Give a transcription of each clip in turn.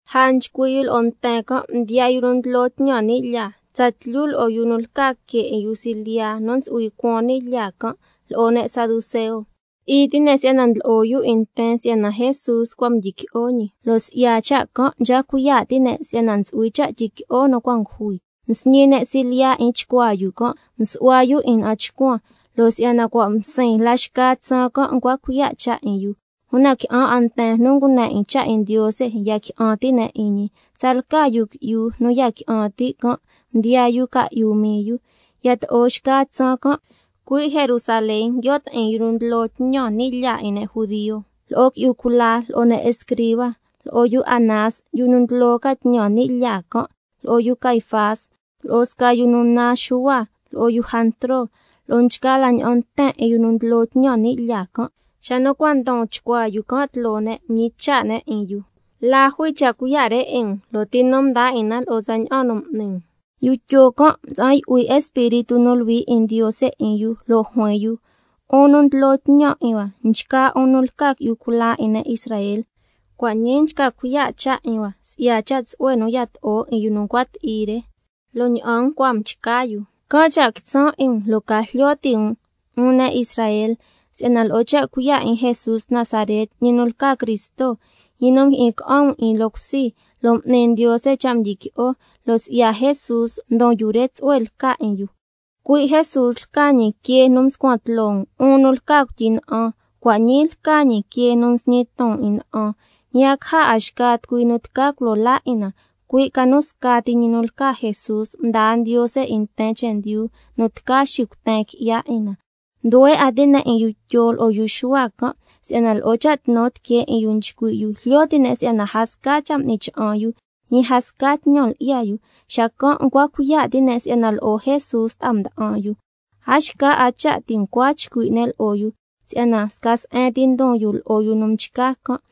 Lja nchcui' yu lo'o nten can' mdiyaa yu nu ndlo tñan ni' lyaa, tsatlyu lo'o yu nu lca que 'in yu silyiya nu ntsu'hui cuan ni' lyaa can', lo'o ne' saduceo. Ti'i ti' ne' si'yana ndlo'o yu 'in nten si'yana Jesús cua' mdyiqui'o ñi, lo' si'ya cha' can' nchca cuiya' ti' ne' si'yana ntsu'hui cha' tyiqui'o nu cua' ngujui. Msñi ne' silyiya 'in chcuaa yu can', msu'hua yu 'in na'an chcuan, lo' si'yana cua' msiin la xca tsaan can' ncua cuiya' cha' 'in yu. Una qui'an 'a nten nu ngune 'in cha' 'in Ndiose ya qui'an ti' ne' 'in ñi. Tsalca yu qui'yu nu ya qui'an ti' can', ndiyaa yu ca'yu mii yu. Yato'o xca tsaan can', cui' Jerusalén nguio' ti'in yu nu ndlo tñan ni' lyaa 'in ne' judio, lo'o qui'yu cula, lo'o ne' escriba, lo'o yu Anás, yu nu ndlo ca tñan ni' lyaa can', lo'o yu Caifás, lo'o sca yu nu naan Xuhua, lo'o yu Jantro, lo'o nchgaa la ña'an nten 'in yu nu ndlo ca tñan ni' lyaa can' nguio' ti'in can'. Xa nu cua' ndon chcuaa yu can' tloo ne' mñicha' ne' 'in yu: ¿La jui cha' cuiya' re 'in um, lo' ti nu mdaa 'in na lo'o tsaña'an nu m'ni um? Yu Tyo can' mtsa'an yu'hui Espíritu nu Luhui 'in Ndiose 'in yu, lo' juin yu: 'Un nu ndlo tñan 'in hua, nchgaa 'un nu lca qui'yu cula 'in ne' Israel, cua' ñii nchca cuiya' cha' 'in hua si'ya cha' tsu'hue nu yato'o 'in yu nu ncua ti'i re, lo' ña'an ncua mchca yu, can' cha' quitsan' 'in um, lo' ca jlyo ti' 'un ne' Israel, si'yana lo'o cha' cuiya' 'in Jesús Nazaret, ñi nu lca Cristo, ñi nu mjyi'in ca'an um 'in loo cusi lo' m'ni Ndiose cha' mdyiqui'o, lo' si'ya Jesús ndon yu re tsu'hue lca 'in yu. Cui' Jesús lca ñi —quee nu mscuan tloo um, 'un nu lca cuityi na'an, cua' ñii lca ñi quee nu nsñi ton 'in na'an—. Ñi a caja 'a xca tucui nu tca culo laa 'in na, cui' ca nu scati ñi nu lca Jesús mdaa Ndiose 'in nten chendyu nu tca xicuten qui'ya 'in na. Nduhue 'a ti' ne' 'in yu Tyo lo'o yu Xuhua can' si'yana lo'o cha' tnu tiquee 'in yu nchcui' yu, jlyo ti' ne' si'yana a sca cha' m'ni cha'an yu, ñi a sca tñan lyi'ya yu, xacan' ncua cuiya' ti' ne' si'yana lo'o Jesús ta'a mda'an yu. A xca 'a cha' ti' ncua chcui' ne' lo'o yu, si'yana sca se'en ti ndon yu lo'o yu nu mchca can'.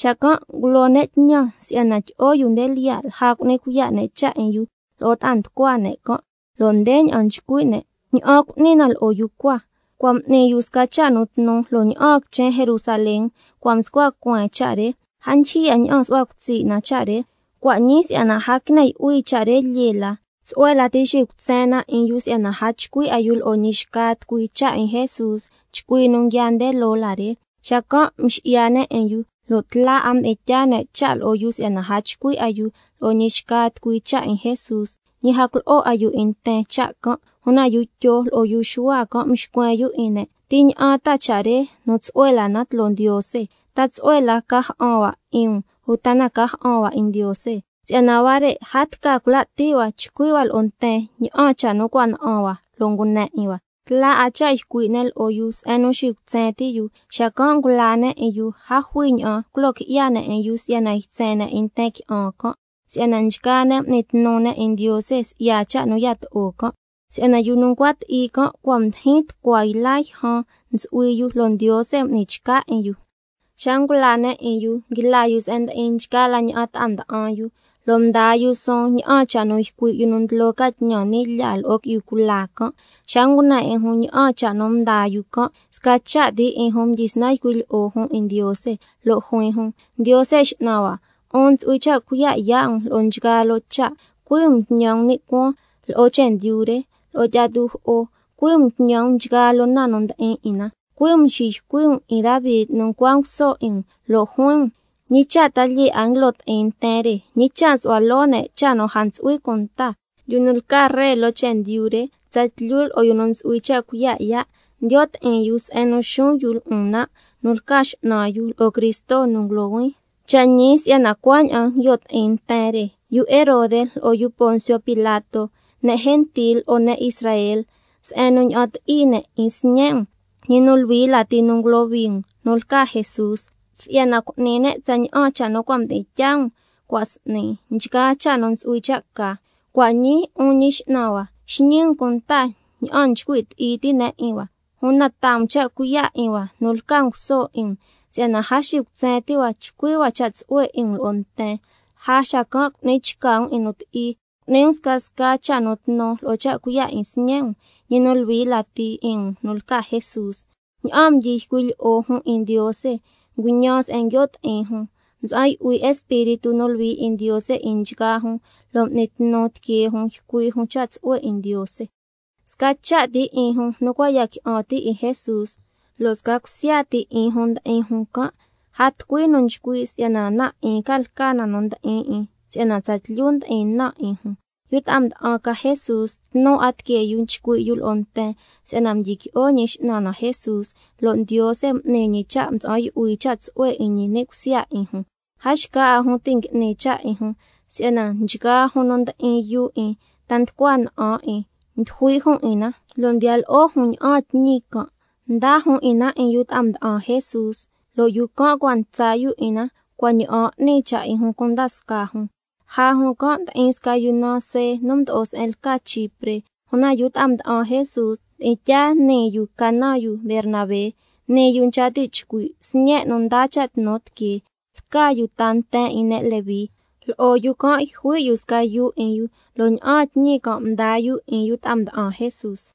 Xacan' ngulo ne' tñan si'yana tyi'o yu nde lyiya' lja cu'ni cuiya' ne' cha' 'in yu lo'o ta'a nducua ne' can', lo' ndeña'an nchcui' ne': ¿Ña'an cu'ni na lo'o yu cua? Cua' m'ni yu sca cha' nu tnu lo' ña'aan quichen Jerusalén cua' mscua cueen cha' re, a ndyijyi 'a ña'an su'hua cutsi' na cha' re. Cua' ñii si'yana a quine yu'hui cha' re lyee la, tsu'hue lati xicutsen na 'in yu si'yana a chcui' 'a yu lo'o ñi xca tucui cha' 'in Jesús chcui nu nguiaa nde loo la re. Xacan' mxi'ya ne' 'in yu, lo' tla 'a mdi'in tyaa ne' cha' lo'o yu si'yana a chcui' 'a yu lo'o ñi xca tucui cha' 'in Jesús, ñi a culo'o 'a yu 'in nten cha' can'. Una yu Tyo lo'o yu Xuhua can' mxcuen yu 'in ne': ¿Ti ña'an ta cha' re nu tsu'hue la na tloo Ndiose? ¿Ta tsu'hue la cha' ca ja'an hua 'in um, uta na ca ja'an hua 'in Ndiose? Si'yana huare' a tca cula ti' hua chcui' hua lo'o nten ña'an cha' nu cua' na'an hua lo' ngune 'in hua. Tla 'a cha' ycui' ne' lo'o yu se'en nu xicutsen ti' yu, xacan' ngulaa ne' 'in yu, a jui ña'an culo qui'ya ne' 'in yu si'yana ytsen ne' 'in nten qui'an can', si'yana nchgaa ne' m'ni tnu ne' 'in Ndiose si'ya cha' nu yato'o can', si'yana yu nu ncua ti'i can' cua' ndyijyin tucua yla yjan ntsu'hui yu, lo' Ndiose m'ni chca 'in yu. Xa ngulaa ne' 'in yu, nguila yu se'en ndi'in nchgaa la ña'an ta'a nda'an yu, mdaa yu suun ña'an cha' nu ycui' yu nu ndlo ca tñan ni' lyaa lo'o qui'yu cula can'. Xa ngune 'in jun ña'an cha' nu mdaa yu can', sca cha' ti 'in jun mdyisnan ycui' lyi'o jun 'in Ndiose, lo' juin jun: Ndiose X'nan hua, 'un ntsu'hui cha' cuiya' yaa' um lo'o nchgaa loo cha', —cui' um mtñan um ni' cuaan, lo'o chendyu re, lo'o tyi'a tujo'o, cui' um mtñan um nchgaa loo na nu ndi'in 'in na—, cui' um mxiycui' um 'in Davi nu ncua nguso 'in um, lo' juin um: ¿—Ñi cha' ta lyee 'a nguilo ti'in nten re, ñi cha' nsu'hua loo ne' cha' nu a ntsu'hui cunta? Yu nu lca ree loo chendyu re, tsatlyu lo'o yu nu ntsu'hui cha' cuiya' yaa', ndiyo' ti'in yu se'en nu xuun yu lo'on nan' nu lca X'nan yu, lo'o Cristo nu ngulohuin—. Cha' ñi si'yana cuaña'an nguio' ti'in nten re, yu Herode lo'o yu Poncio Pilato, ne' gentil lo'o ne' Israel, se'en nu ña'an ti'i ne' 'in Sñe' um, ñi nu luhui lati nu ngulohui um, nu lca Jesús, si'yana cu'ni ne' tsaña'an cha' nu cua' mdi'in tyaa um cua' s'ni, nchgaa cha' nu ntsu'hui cha' ca. Cua' ñii, 'un Ñi X'nan hua, xñi um cunta ña'an nchcui' ti'i ti' ne' 'in hua, una taa um cha' cuiya' 'in hua nu lca nguso 'in um, si'yana a xicutsen ti' hua chcui' hua cha' tsu'hue 'in um lo'o nten, lja xacan' cu'ni chca um 'in nu ti'i, cu'ni um scasca cha' nu tnu lo'o cha' cuiya' 'in Sñe' um, ñi nu luhui lati 'in um nu lca Jesús. Ña'aan mdyi ycui' lyi'o jun 'in Ndiose, nguñan se'en nguio' ti'in jun, mtsa'an yu'hui Espíritu nu Luhui 'in Ndiose 'in nchgaa jun, lo' m'ni tnu tiquee jun ycui' jun cha' tsu'hue 'in Ndiose. Sca cha' ti 'in jun nu cua' ya qui'an ti' 'in Jesús, lo' sca cusya ti 'in jun ndi'in jun can', a tucui nu nchcui' si'yana na 'in lca na nu ndi'in 'in, si'yana tsatlyu ndi'in na 'in jun. Yu ta'a mda'an ca Jesús, tnu 'a tiquee yu nchcui' yu lo'o nten si'yana mdyiqui'o Ñi X'nan na Jesús, lo' Ndiose m'ni ñi cha' mtsa'an yu'hui cha' tsu'hue 'in ñi ni' cusya 'in jun. A xca 'a jun ti' ngui'ni cha' 'in jun, si'yana nchgaa jun nu ndi'in yuu 'in, ta nducua na'an 'in, ndyijui' jun 'in na lo' ndiya lo'o jun ña'aan tñi can', ndaa jun 'in na 'in yu ta'a mda'an Jesús, lo' yu can' cua' ntsa yu 'in na cua' ña'aan 'ni cha' 'in jun cunda scaa jun. Lja jun can' ndi'in sca yu naan See nu mdo'o se'en lca Chipre, una yu ta'a mda'an Jesús mdi'in tyaa nii yu ca naan yu Bernabé. (Nii yu nchca ti' chcui': Sñe' nu ndaa cha' tnu tiquee.) Lca yu ta nten 'in ne' Leví. Lo'o yu can' yjui' yu sca yuu 'in yu, lo' ña'aan tñi can' mdaa yu 'in yu ta'a mda'an Jesús.